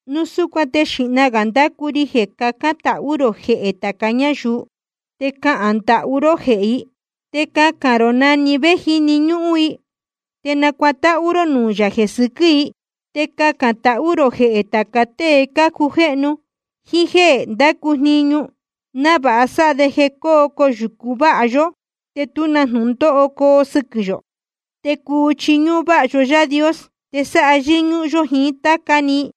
Núu súcuan te xīhna gā ndácu ri jeē cacán tahú rō jehē tāca ñáyuu. Te cahān ndahú ró jehē i, te cacān rō na‑ni na vé jíni ñúhún i, te nacuatáhú ró nuū yā jeē sɨquɨ́ i. Te cacān tahú rō jehē tāca tée cácujéhnu jíín jéē ndácu jniñu, návāha sáha de jeē cuu coyūcu váha yó te tú na jnūndóho coo sɨquɨ̄ yō, te cuu chiñúhún váha yó Yaā Dios te sáha yɨ́ñúhún yó jiín táca‑ni.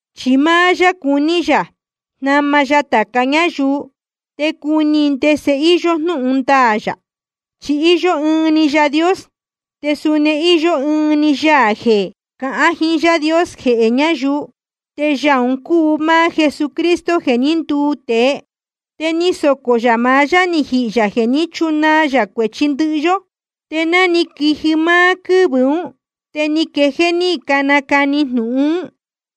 Chi máá yá cuní yā jnama ya tāca ñáyuu te cuni i ndese íyó jnúhun ndaā yā. Chi íyó ɨɨn‑ni Yaā Dios, te suni íyó ɨɨn‑ni Yaā jeē cahán jiín Yaā Dios jehē ñáyuu. Te Yaā un cúu máá Jesucristo jeē ní nduu tēe. Te ni socō yā maá yá ni jihī yā jeē ní chunaa yā cuēchi ndɨhɨ yó. Te ná ni quiji máá quɨ́vɨ̄ ún, te ni quejéé ní canacani jnūhun ún.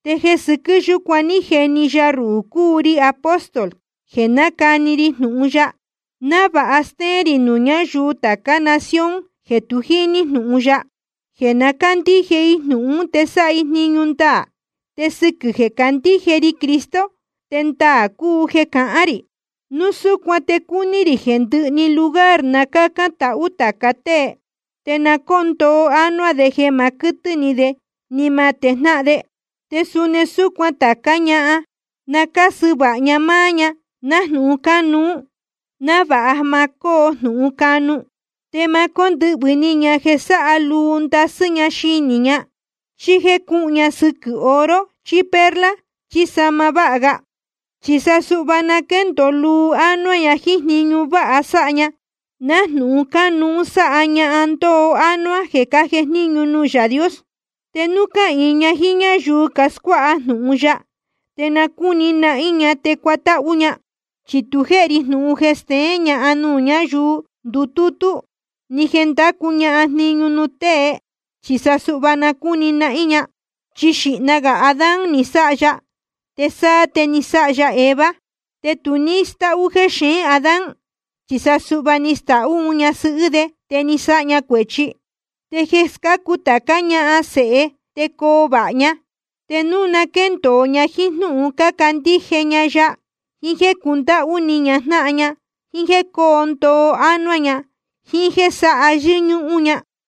Te jeē sɨquɨ́ yúcuan ní jeni ya ruhū cúu ri apóstol jeē nácani ri jnūhun ya, návāha stéén rī nuū ñáyuu tācá nación jeē tu jíní jnūhun ya, jeē na cándíje i jnūhun ún te sáha i jniñu ndaā. Te sɨquɨ̄ jeē candíje ri Cristo te ndaā cúu jeē cahán rī. Núu súcuan te cúní rī jeē ndɨhɨ‑ni lugar na cácán tahú tāca tée. Te na cóo ndoo ánuá de jeē ma quɨtɨ́ ni de ni ma tejnáhan de. Te suni súcuan tācá ñahan, na cásɨ vāha ña máá ña nájnūhun cánuú, návāha ma cóo jnūhun canu. Te ma cóndɨhvɨ̄ ni ña jeē sáha luu ndasɨ́ ña xinī ña, chí jéē cuhun ña sɨquɨ̄ oro chí perla chí sahma váha ga. Chi sa suhva na quéndōo luu ánuá ña jíín jniñu váha sáha ña, nájnūhun cánuú sáha ñahan ndoo ánuá jeē cájejníñu nuū Yaā Dios. Te núu cáhīin ña jíín ñáyuu cascuáha jnūhun ya, te na cúni nahín ña te cuatáhú ña. Chi tu jéhe ri jnūhun jeē steén ñahan nuū ñáyuu ndutútú, ni jeē ndácu ña jniñu nuū tēe. Chi sa suhva na cúni nahín ña. Chi xīhna gā Adán ni sáha ya, te sáá te ni sáha ya Eva. Te tu ní stáhú jexeén Adán, chi sa suhva ni stahú un ñasɨhɨ́ de, te ni sáha ña cuēchi. Te jeē scácu tācá ña sēhe te coo vāha ña, te núu na quéndōo ña jíín jnúhun cándíje ña ya, jíín jéē cundáhú ni ña jnáhan ña, jíín jéē cóo ndoo ánuá ña, jíín jéē sáha yɨ́ñúhún ña.